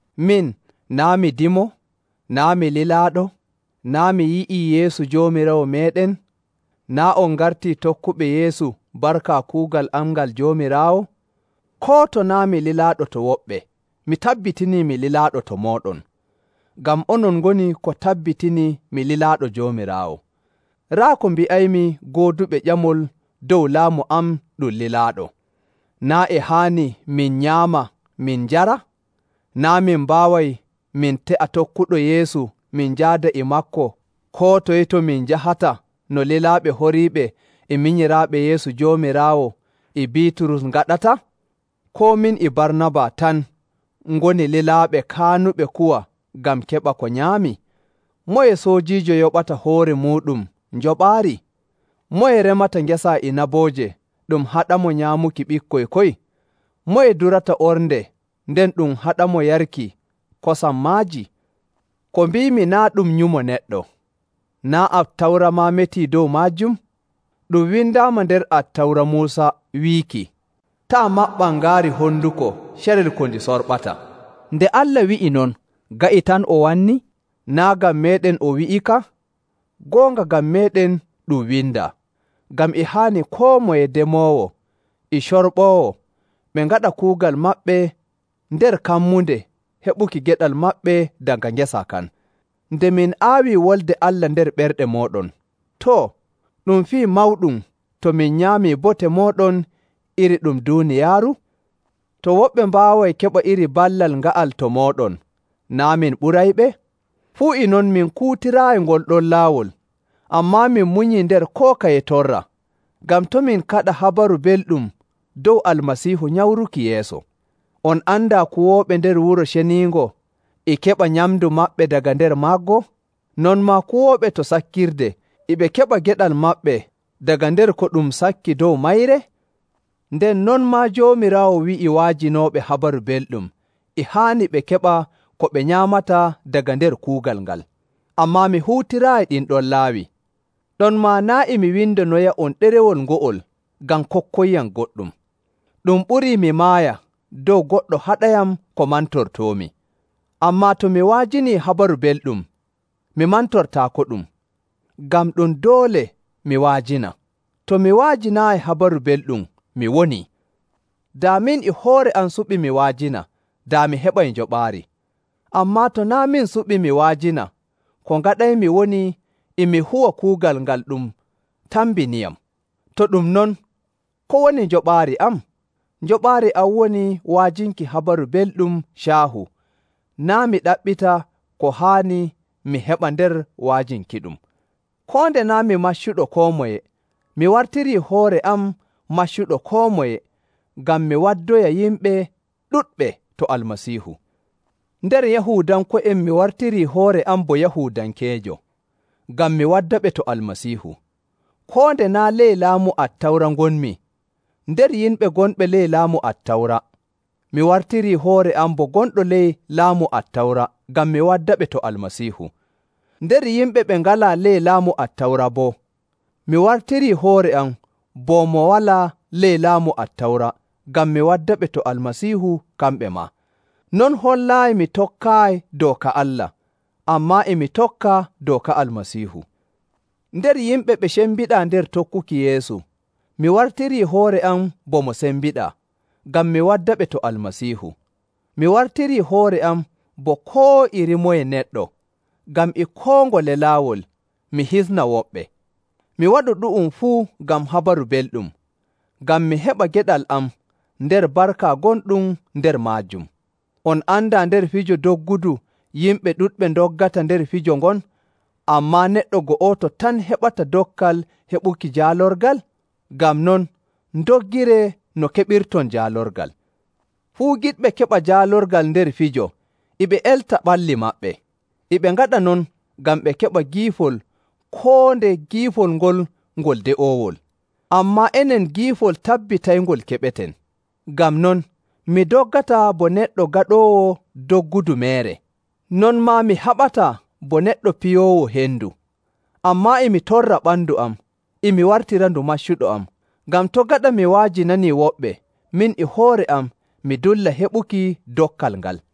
Min, naa' mi dimo? Naa' mi lilaaɗo? Naa' mi yi'ii Yeesu Joomiraawo meeɗen? Naa' on ngartii tokkuɓe Yeesu barka kuugal am ngal Joomiraawo? Koo to naa' mi lilaaɗo to woɓɓe, mi tabbitinii mi lilaaɗo to mooɗon! Ngam onon ngoni ko tabbitini mi lilaaɗo Joomiraawo. Raa ko mbi'aymi gooduɓe ƴamol dow laamu am ɗum lilaaɗo. Naa' e haani min nyaama min njara? Naa' min mbaaway min te'a tokkuɗo Yeesu min njaada e maako koo toye to min njahata no lilaaɓe horiiɓe, e minyiraaɓe Yeesu Joomiraawo, e Biiturus ngaɗata? Koo min e Barnaba tan ngoni lilaaɓe kaanuɓe kuwa ngam keɓa ko nyaami? Moye soojiijo yoɓata hoore muuɗum njoɓaari? Moye remata ngesa inabooje ɗum haɗamo nyaamuki ɓikkoy koy? Moye durata ornde nden ɗum haɗamo yarki kosam maaji? Ko mbiimi naa' ɗum nyumo neɗɗo. Naa' Attawra maa metii dow maajum? Ɗum windaama nder Attawra Muusa wiiki, “Taa' maɓɓan ngaari honduko carel ko ndi sorɓata.” Nde Allah wi'i non, ga'i tan o wanni? Naa' ngam meeɗen o wi'ika? Goonga ngam meeɗen ɗum windaa. Ngam e haani koo moye demoowo e corɓoowo ɓe ngaɗa kuugal maɓɓe nder kammunde heɓuki geɗal maɓɓe daga ngesa kan. Nde min aawi Wolde Allah nder ɓerɗe mooɗon, too, ɗum fii mawɗum to min nyaamii bote mooɗon iri ɗum duuniyaaru? To woɓɓe mbaaway keɓa iri ballal nga'al to mooɗon, naa' min ɓurayɓe? Fuu e non min kuutiraayi ngol ɗon laawol, ammaa min munyii nder koo kaye torra, ngam to' min kaɗa Habaru Belɗum dow Almasiihu nyamruki yeeso. On andaa kuwooɓe nder Wuro Ceniingo e keɓa nyamndu maɓɓe daga nder maggo? Non maa kuwooɓe to sakkirde e ɓe keɓa geɗal maɓɓe daga nder ko ɗum sakki dow mayre? Nden non maa Joomiraawo wi'ii wa'ajinooɓe Habaru Belɗum e haani ɓe keɓa ko ɓe nyaamata daga nder kuugal ngal. Ammaa mi huutiraayi ɗin ɗon laawi. Ɗonmaa naa' e mi windonoya'on ɗerewol ngo'ol ngam kokkoyyam goɗɗum. Ɗum ɓurii mi maaya dow goɗɗo haɗayam ko mantortoomi. Ammaa to mi wa'ajinii Habaru Belɗum, mi mantortaakoɗum, ngam ɗum doole mi wa'ajina. To mi wa'ajinaayi Habaru Belɗum mi woni! Daa min e hoore am suɓi mi wa'ajina, daa mi heɓay njoɓaari. Ammaa to naa' min suɓi mi wa'ajina, ko ngaɗaymi woni e mi huwa kuugal ngal ɗum tambiniyam. To ɗum non, ko woni njoɓaari am? Njoɓaari am woni wa'ajinki Habaru Belɗum caahu, naa' mi ɗaɓɓita ko haani mi heɓa nder wa'ajinkiɗum. Koo nde naa' mi maccuɗo koo moye, mi wartirii hoore am maccuɗo koo moye ngam mi waddoya yimɓe ɗuɗɓe to Almasiihu. Nder Yahuudanko'en mi wartirii hoore am bo Yahuudankeejo, ngam mi waddaɓe to Almasiihu. Koo nde naa' ley laamu Attawra ngonmi, nder yimɓe gonɓe ley laamu Attawra, mi wartirii hoore am bo gonɗo ley laamu Attawra ngam mi waddaɓe to Almasiihu. Nder yimɓe ɓe ngalaa ley laamu Attawra boo, mi wartirii hoore am bo mo walaa ley laamu Attawra ngam mi waddaɓe to Almasiihu kamɓe maa. Non hollaayi mi tokkaayi dooka Allah, ammaa e mi tokka dooka Almasiihu. Nder yimɓe ɓe cembiɗaa nder tokkuki Yeesu, mi wartirii hoore am bo mo sembiɗaa, ngam mi waddaɓe to Almasiihu. Mi wartirii hoore am bo koo iri moye neɗɗo ngam e koo ngole laawol mi hisna woɓɓe. Mi waɗu ɗu'um fuu ngam Habaru Belɗum, ngam mi heɓa geɗal am nder barka gonɗum nder maajum. On andaa nder fijo doggudu yimɓe ɗuɗɓe ndoggata nder fijo ngon, ammaa neɗɗo go'oto tan heɓata dokkal heɓuki jaalorgal? Ngam non, ndoggiree no keɓirton jaalorgal. Fuu giɗɓe keɓa jaalorgal nder fijo e ɓe elta ɓalli maɓɓe. E ɓe ngaɗa non ngam ɓe keɓa giifol koo nde giifol ngol ngol de'oowol. Ammaa enen giifol tabbitayngol keɓeten. Ngam non, mi doggataa bo neɗɗo gaɗoowo doggudu meere. Non maa mi haɓataa bo neɗɗo piyoowo hendu. Ammaa e mi torra ɓandu am, e mi wartirandu maccuɗo am, ngam to' gaɗa mi wa'ajinanii woɓɓe, min e hoore am mi dulla heɓuki dokkal ngal.